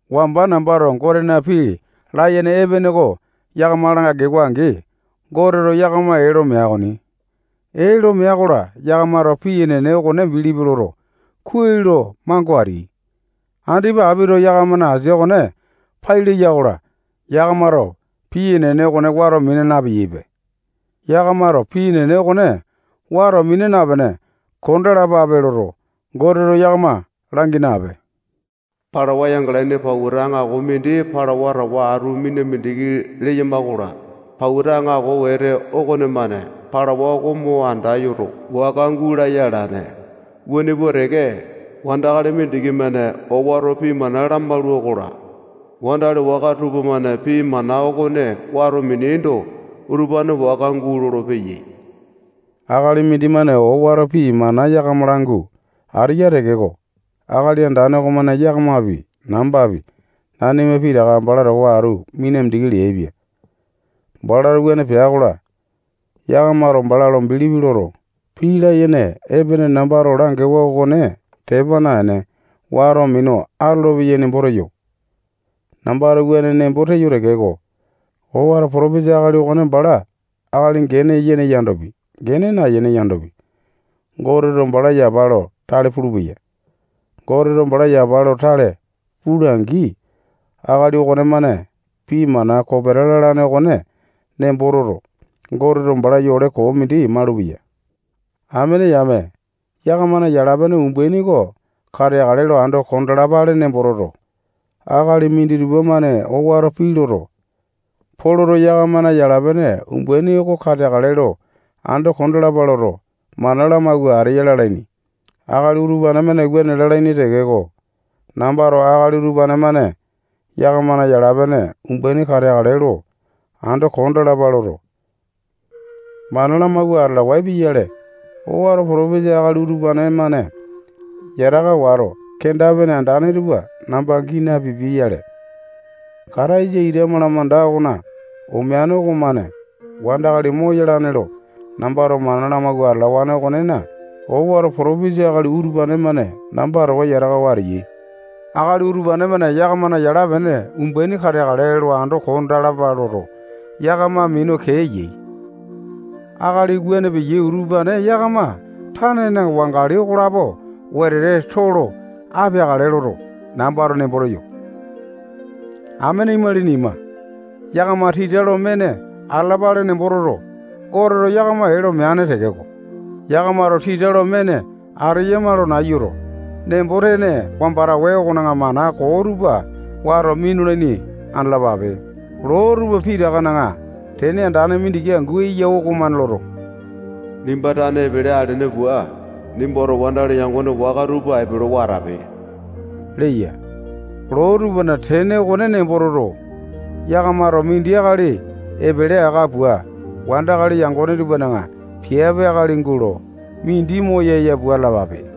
Wamba nambato Gotena pii layene epene oko yakama langewa-angi, Goteto yakama ee lo mea okoni. Ee lo mea-kola, yakamato pii enene okone bilipi loto, kuai lo mango ateai. Andipa apito yakamana asia okone pai leya-kola, yakamato pii enene okone wato mina napeyaipe. Yakamato pii enene okone wata mina napene kondalapape loto, Goteto yakama langi nape. Palawa yangalaini pauta aŋako mindi palauwa towa atu mina mindiki leyama-kola, pauta aŋako wete okonemane palauwa okone mo andayoto, waka gulaya alane. Wuane pua teke, wandakali mindiki-mane owato pii mana lamaula-kola, wandakali waka tupamane pii mana okone wato mineaindo, utupane waka gulolo-peyai. Akali mindimane owato pii mana yakama langu ateya tekeko, Akali Andane okomane yakamapi, nambapi, nanima pitaka bala towa atu mina mindiki leaipia. Balato wuane pea-kola, yakamato bala lo bilipi loto, pii layene epene nambato langewa okone tepa naene, wato minu atolopeyai nembo teyo. Nambato wuane nembo teyo tekeko, owato potopesa akali okone bala akali gene yene yandopi, gene nayene yandopi, Goteto bala yapa lo tale pulupeya. Goteto bala yapa lo tale pula-angi, akali okonemane pii mana kopeta lalane okone nembo toto, Goteto bala yole koo mindi malupeya. Amene yame, yakamana yala-pene umbaini oko kateakale lo ando kondalapale nembo toto, akali minditupa-mane owato pii loto, Poloto yakamana yala-pene umbaini oko kateakale lo ando kondalapa loto, mana lamawua ateya lalaini. Akali utupane-mane wuane lalaini tekeko, nambato akali utupane-mane yakamana yala-pene umbaini kateakale lo ando kondalapa loto, mana lamawua atalawae pia-yale, owato potopesa akali utupane-mane yataka wato, kenda-pene andane tupa namba gii napipia-yale. Kataisa ita malamanda okona omeane okomane wandakali moyalane lo nambato mana lamawua atalawane okonena, owato potopesa akali utupane-mane namba towa yatakawa ateyai. Akali utupane-mane yakamana yala-pene umbaini kateakale lo ando kondalapa loto, yakama minu kee eyai. Akali wuane peyai utupane yakama tanena wangali okolapo wetete too lo apeakale loto, nambato nembo teyo. Amene imalini ima, yakama tita lo mene atalapale nembo toto, Goteto yakama ee lo meane tekeko, yakamato tita lo mene ateyama lo nayuto, nembo-tene wambane okona mana koo tupa wato minulaini andalapape. Loo tupa pitakana tene andane mindiki angu eya okomane loto, nimba tane epele alene pua, nimbato wandakali yangone waka tupa epelewa atape leya. Loo tupana tene okone nembo toto, yakamato mindi akali epele aka pua, wandakali yangone tupana piape akali gulo, mindi moyaya pua atalapape.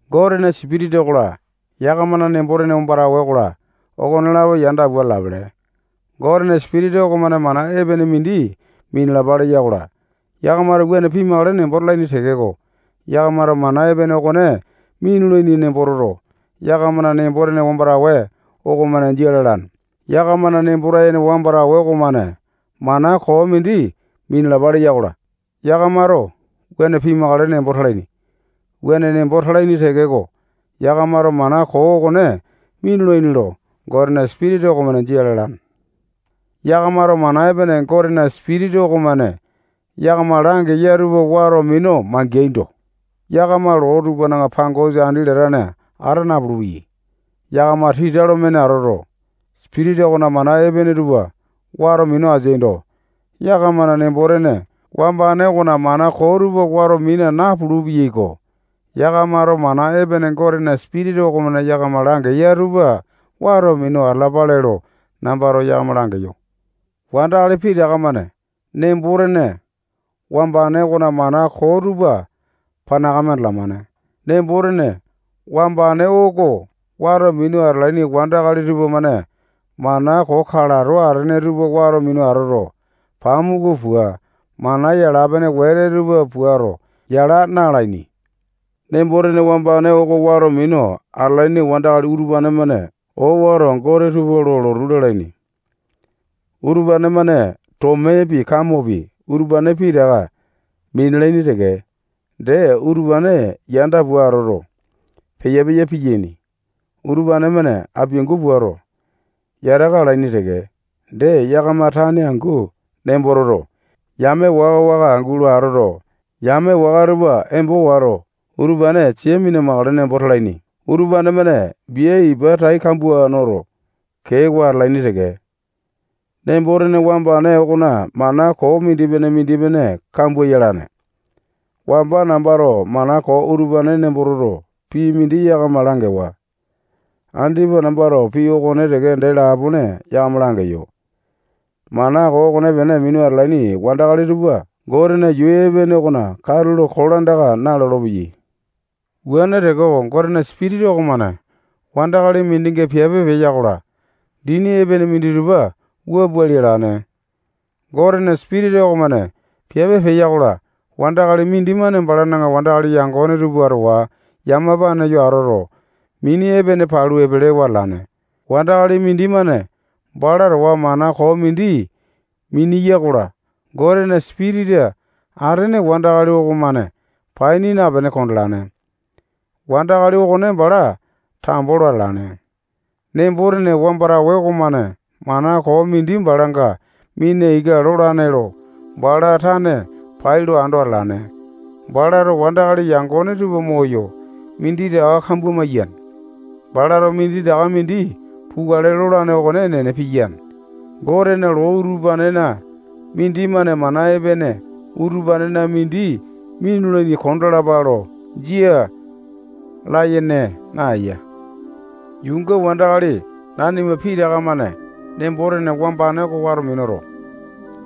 Gotena Sipitisa okola, yakamana nembo-tene wambane okola, okonelapo yanda pua atalapele. Gotena Sipitisa okomane mana epene mindi minalapa leya-kola, yakamato wuane pimakale nembo talaini tekeko, yakamato mana epene okone minulaini nembo toto, yakamana nembo-tene wambane okomane jia lalane. Yakamana nembo-tene wambane okomane mana koo mindi minalapa leya-kola, yakamato wuane pimakale nembo talaini. Wuane nembo talaini tekeko, yakamato mana koo okone minulaini lo, Gotena Sipitisa okomane jia lalane. Yakamato mana epene Gotena Sipitisa okomane yakama langeya tupa wato minu mangeaindo, yakama loo tupana pangosa andi latane ata napulu-peyai. Yakama tita lo mene atoto, Sipitisa okona mana epene tupa wato minu ateaindo, yakamana nembo-tene wambane okona mana koo tupa wato mina napulu-peyaiko. Yakamato mana epene Gotena Sipitisa okomane yakama langeya tupa wato minu atalapape lo, nambato yakama langeyo. Wandakali pitaka-mane nembo-tene wambane okona mana koo tupa panakame andalamane. Nembo-tene wambane oko wato minu atalaini wandakali tupamane mana koo kalato atene tupa wato minu atoto, pamuku pua, mana yala-pene wete tupa puato, yala na-alaini. Nembo-tene wambane oko wato minu atalaini wandakali utupane-mane owato gote tupa lo lotu lalaini. Utupane-mane tomepi, kamopi, utupane pitaka minalaini teke. Dee, utupane yanda-pene atoto, peya-peya piyaini. Utupane-mane apiangu puato, yataka alaini teke. Dee, yakama tane angu nembo toto, yame waka-waka gulo atoto, yame waka tupa embo wato, utupane sia mina-makale nembo talaini. Utupane-mane bia ipa tai kambua noto, keewa atalaini teke. Nembo-tene wambane okona mana koo mindipene-mindipene kambua yalane. Wamba nambato mana koo utupane nembo toto, pii mindi yakama langewa. Andipa nambato pii okone teke dee lapone yakama langeyo. Mana koo okonepene minu atalaini wandakali tupa Gotena yuu epene okona katulo kolandaka na-lolopeyai. Wuane tekeko, Gotena Sipitisa okomane wandakali mindinga piape peya-kola, dini epene minditupa wua pua lialane: Gotena Sipitisa okomane piape peya-kola, wandakali mindimane balana wandakali yangone tupa towa yamapane yo atoto, mini epene palu epelewa atalane. Wandakali mindimane bala towa mana koo mindi miniyai-kola, Gotena Sipitisa atene wandakali okomane paini napene kondalane. Wandakali okone bala tambo lo atalane. Nembo-tene wambane okomane mana koo mindi balanga mina ika lolane lo, bala tane pai lo ando atalane. Balato wandakali yangone tupa moyo, minditaka kambua maiyane. Balato minditaka mindi pukale lolane okone enene piyane. Gotena loo utupanena mindimane mana epene utupanena mindi minulaini kondalapa lo jia layene naeya. Yuunga wandakali nanima pitaka-mane nembo-tene wambane oko wato minuto,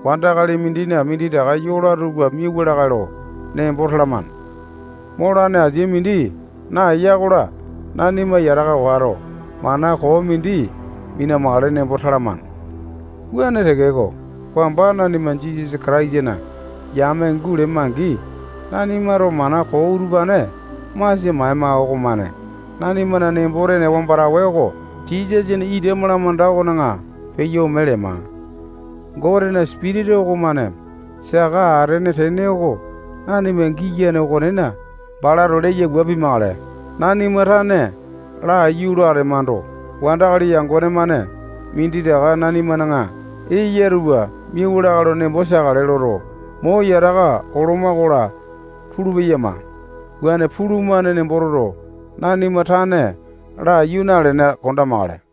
wandakali mindina minditaka yola tupa miauwa lakae lo nembo talamane. Molane asia mindi naeya-kola, nanima yataka wato, mana koo mindi mina-makale nembo talamane. Wuane tekeko, wamba nanima Jisasa Kataisana yame gulema-angi, nanimato mana koo utupane masia maema okomane nanimana nembo-tene wambane oko Jisasana ita malamanda okona peyo ome lema. Gotena Sipitisa okomane saka atene tene oko nanima giyane okonena, balato leya pimakale. Nanima tane laiyu lo atemando, wandakali yangone-mane minditaka nanimana eyama tupa miauwa lakae lo nembo teakale loto, mo yataka oloma-kola, pulu-peyama. Wuane pulumane nembo toto, nanima tane laiyu nalene, kondamakale.